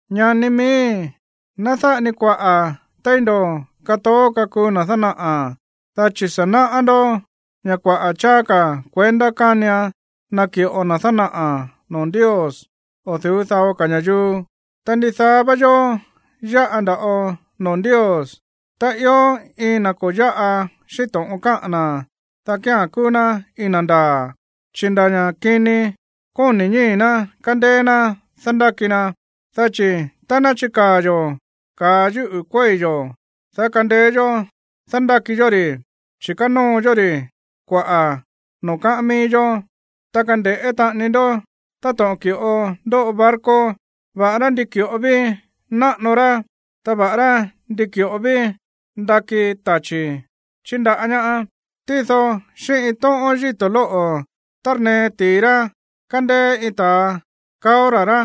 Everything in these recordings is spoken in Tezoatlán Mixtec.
Ñani miíi̱, ná dáꞌa ni kuaꞌa̱ téí ndo̱ katoó kakuu na̱ dánaꞌa̱, dá chi̱ sa̱ náꞌá ndó ña̱ kuaꞌa̱ cháá ka̱ kuendá kánian naki̱ꞌo na̱ dánaꞌa̱ noo̱ Ndios o̱ du̱ú dao ka̱ ña̱yuu. Ta ndidaá vá yó yáꞌa nda̱ꞌo noo̱ Ndios. Tá ió iin na̱ ko̱ yáꞌa xíꞌín to̱ꞌon káꞌa̱n na̱, dá kía̱n kúú ná iin na̱ ndaa̱, chi̱ nda̱ ña̱ kini kóni̱ ñíi̱ ná kándéé ná dándáki na. Dá chi̱ tá ná chikaa̱ yo̱ ka̱a yúꞌu̱ kuéi̱ yo̱, dá kandeé yó dándáki yó ri̱, chi̱ kanóo yó ri̱ kuaꞌa̱ noo̱ káꞌán mií yó. Ta kande̱ꞌé taꞌani ndó táto̱ꞌon ki̱ꞌo ndóꞌo barco, va̱ꞌará ndi ki̱ꞌo ví náꞌano rá, ta va̱ꞌará ndi ki̱ꞌo ví ndakí tachi̱ chíndaꞌá ñá, tído xíꞌín iin tóꞌón yíto̱ lóꞌo̱ tárnee ti̱i rá kándéé iin ta̱a kaó ra̱ rá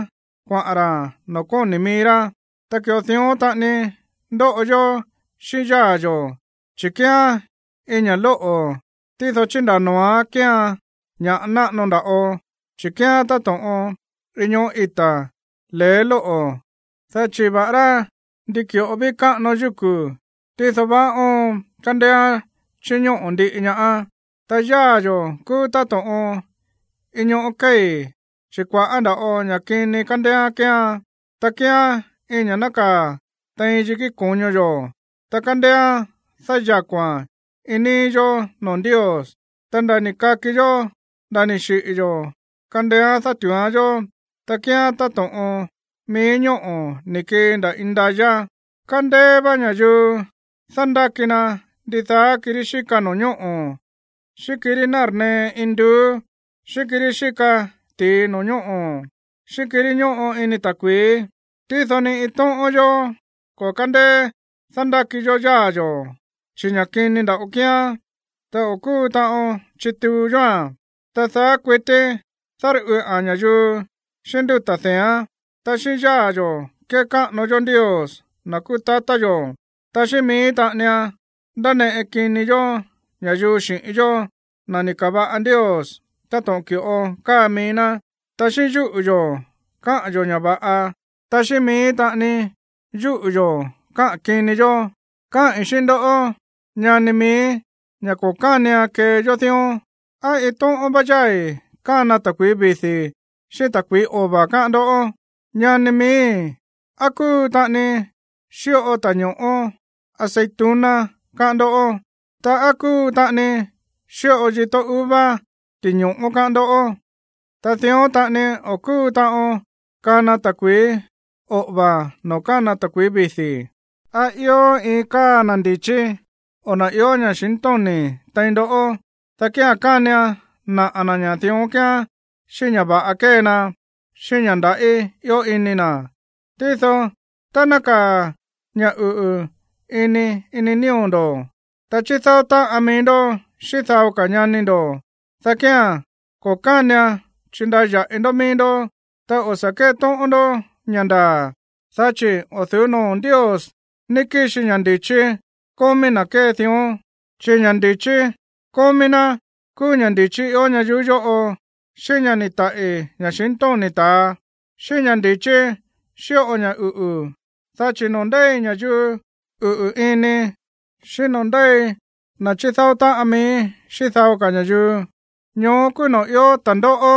kuaꞌa̱n ra̱ noo̱ kóni̱ mií rá. Ta ki̱ꞌo dión taꞌani ndóꞌo yó xíꞌín yáa̱ yo̱, chi̱ kíán iin ña̱ lóꞌo̱, tído chíndaa̱ noo̱án kéean ña̱ꞌa náꞌano nda̱ꞌo. Chi̱ kíán táto̱ꞌon iin ñoꞌó ita̱ le̱é lóꞌo̱, dá chi̱ va̱ꞌará ndi ki̱ꞌo ví káꞌano yúku̱, tído vaá óon kándééán chíñóꞌo̱ ndiꞌi ñaá. Ta yáa̱ yo̱ kúú táto̱ꞌon iin ñoꞌó kéi̱, chi̱ kua̱ꞌá nda̱ꞌo ña̱ kini kándééán kéean. Ta kíán iin ña̱ nákaa̱ tein yikí ko̱ño yo̱, ta kándééán dáyako̱a̱n iin níí yó noo̱ Ndios. Ta nda̱ ni̱ kaki yó nda̱ ni̱ xiꞌi̱ yo̱ kándééán dátu̱úán yó. Ta kíán táto̱ꞌon mií ñóꞌo̱ ni̱ kii nda̱ indayá. Kándéé vá ña̱yuu dándáki na ndidaá kirí xíka no̱ñóꞌo̱, xíꞌín kirí nárnee induú, xíꞌín kirí xíka ti̱i no̱ñóꞌo̱, xíꞌín kirí ñóꞌo ini ta̱kui̱í. Tído ni iin tóꞌón yó o̱ kándéé dándáki yó yáa̱ yo̱, chi̱ ña̱ kini nda̱ꞌo kíán, ta o̱ kúu taꞌon chituu yóa̱n. Ta daá kuití dárꞌuꞌa̱n ña̱yuu xíꞌín ndutá dee̱án. Ta xíꞌín yáa̱ yo̱ kékáꞌano yó Ndios, na̱ kúú tatá yo̱, ta xíꞌín mií taꞌanian ndáneꞌe kini yó ña̱yuu xi̱ꞌín yó, na̱ ni̱ ka̱va̱ꞌa Ndios táto̱ꞌon ki̱ꞌo káa mií ná. Ta xíꞌín yúꞌu̱ yo̱ káꞌa̱n yo̱ ña̱ va̱ꞌa, ta xíꞌín mií taꞌani yúꞌu̱ yo̱ káꞌa̱n kini yó. Káꞌi̱n xíꞌín ndó, ñani miíi̱, ña̱ ko̱ kánian kee yó dión. ¿Á iin tóꞌón vá yái̱ kána ta̱kui̱í vidi̱ xíꞌín ta̱kui̱í ova̱, káꞌán ndó? Ñani miíi̱, ¿á kúu taꞌani xíꞌo ta̱ño̱ꞌó aceituna, káꞌán ndó? Ta, ¿á kúu taꞌani xíꞌo yitó uva ti̱ño̱ꞌó, káꞌán ndó? Ta dión taꞌani o̱ kúu taꞌon kana ta̱kui̱í oꞌo̱va̱ noo̱ kána ta̱kui̱í vidi̱. ¿Á ió iin káa na̱ ndi̱chí, o na̱ ió ña̱xintóni̱ tein ndoꞌó? Dá kía̱n kánian naꞌa̱ na̱ ña̱ dión kíán xíꞌín ña̱ va̱ꞌa kée na, xíꞌín ña̱ ndaꞌí ió ini na̱. Tído tá nákaa̱ ña̱ uꞌu̱ ini ini nío̱ ndo̱, ta chídáó táꞌan mií ndó xíꞌín dao ka̱ ñani ndo̱, dá kía̱n ko̱ kánian chindaya̱ꞌi ndó mií ndó, ta o̱ sa̱ kétóꞌón ndó ña̱ ndaa̱. Dá chi̱ o̱ du̱ú noo̱ Ndios ní kixi ña̱ ndi̱chí kómí na̱ kée dión, chi̱ ña̱ ndi̱chí kómí ná kúú ña̱ ndi̱chí ió ñayuú yóꞌo, xíꞌín ña̱ ni̱ taꞌi̱ ña̱xintóni̱ ta̱a, xíꞌín ña̱ ndi̱chí xíꞌo ña̱ uꞌu̱. Dá chi̱ noo̱ ndéi ña̱yuu uꞌu̱ ini, xíꞌín noo̱ ndéi na̱ chídáó táꞌan mií xíꞌín dao ka̱ ña̱yuu, ñoó kúú noo̱ ió ta̱ndóꞌó,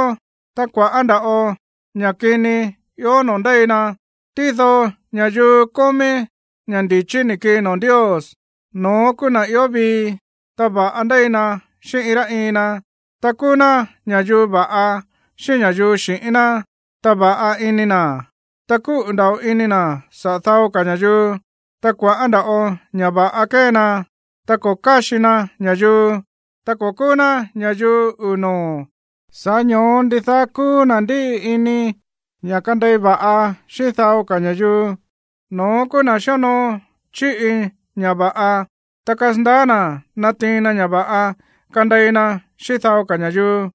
ta kua̱ꞌá nda̱ꞌo ña̱ꞌa kini ió noo̱ ndéi na. Tído ña̱yuu kómí ña̱ ndi̱chí ni̱ kii noo̱ Ndios, no̱ón kúú na̱ ió vii, ta va̱ꞌa ndéi na xíꞌín iin rá iin na, ta kúú ná ña̱yuu va̱ꞌa xíꞌín ña̱yuu xi̱ꞌín ná, ta va̱ꞌa ini na̱, ta kúꞌu̱ nda̱ꞌo ini na̱ saꞌa̱ dao ka̱ ña̱yuu, ta kua̱ꞌá nda̱ꞌo ña̱ va̱ꞌa kée na, ta ko̱ káxi na ña̱yuu, ta ko̱ kúú ná ña̱yuu uu̱ noo̱. Sa̱ꞌá ño̱ó ndidaá kúú na̱ ndíꞌi ini ña̱ kandei va̱ꞌa xíꞌín dao ka̱ ña̱yuu, no̱ón kúú na̱ xíonoo chíꞌi ña̱ va̱ꞌa, ta kasandaá na̱ natiin na ña̱ va̱ꞌa kandei na xíꞌín dao ka̱ ña̱yuu.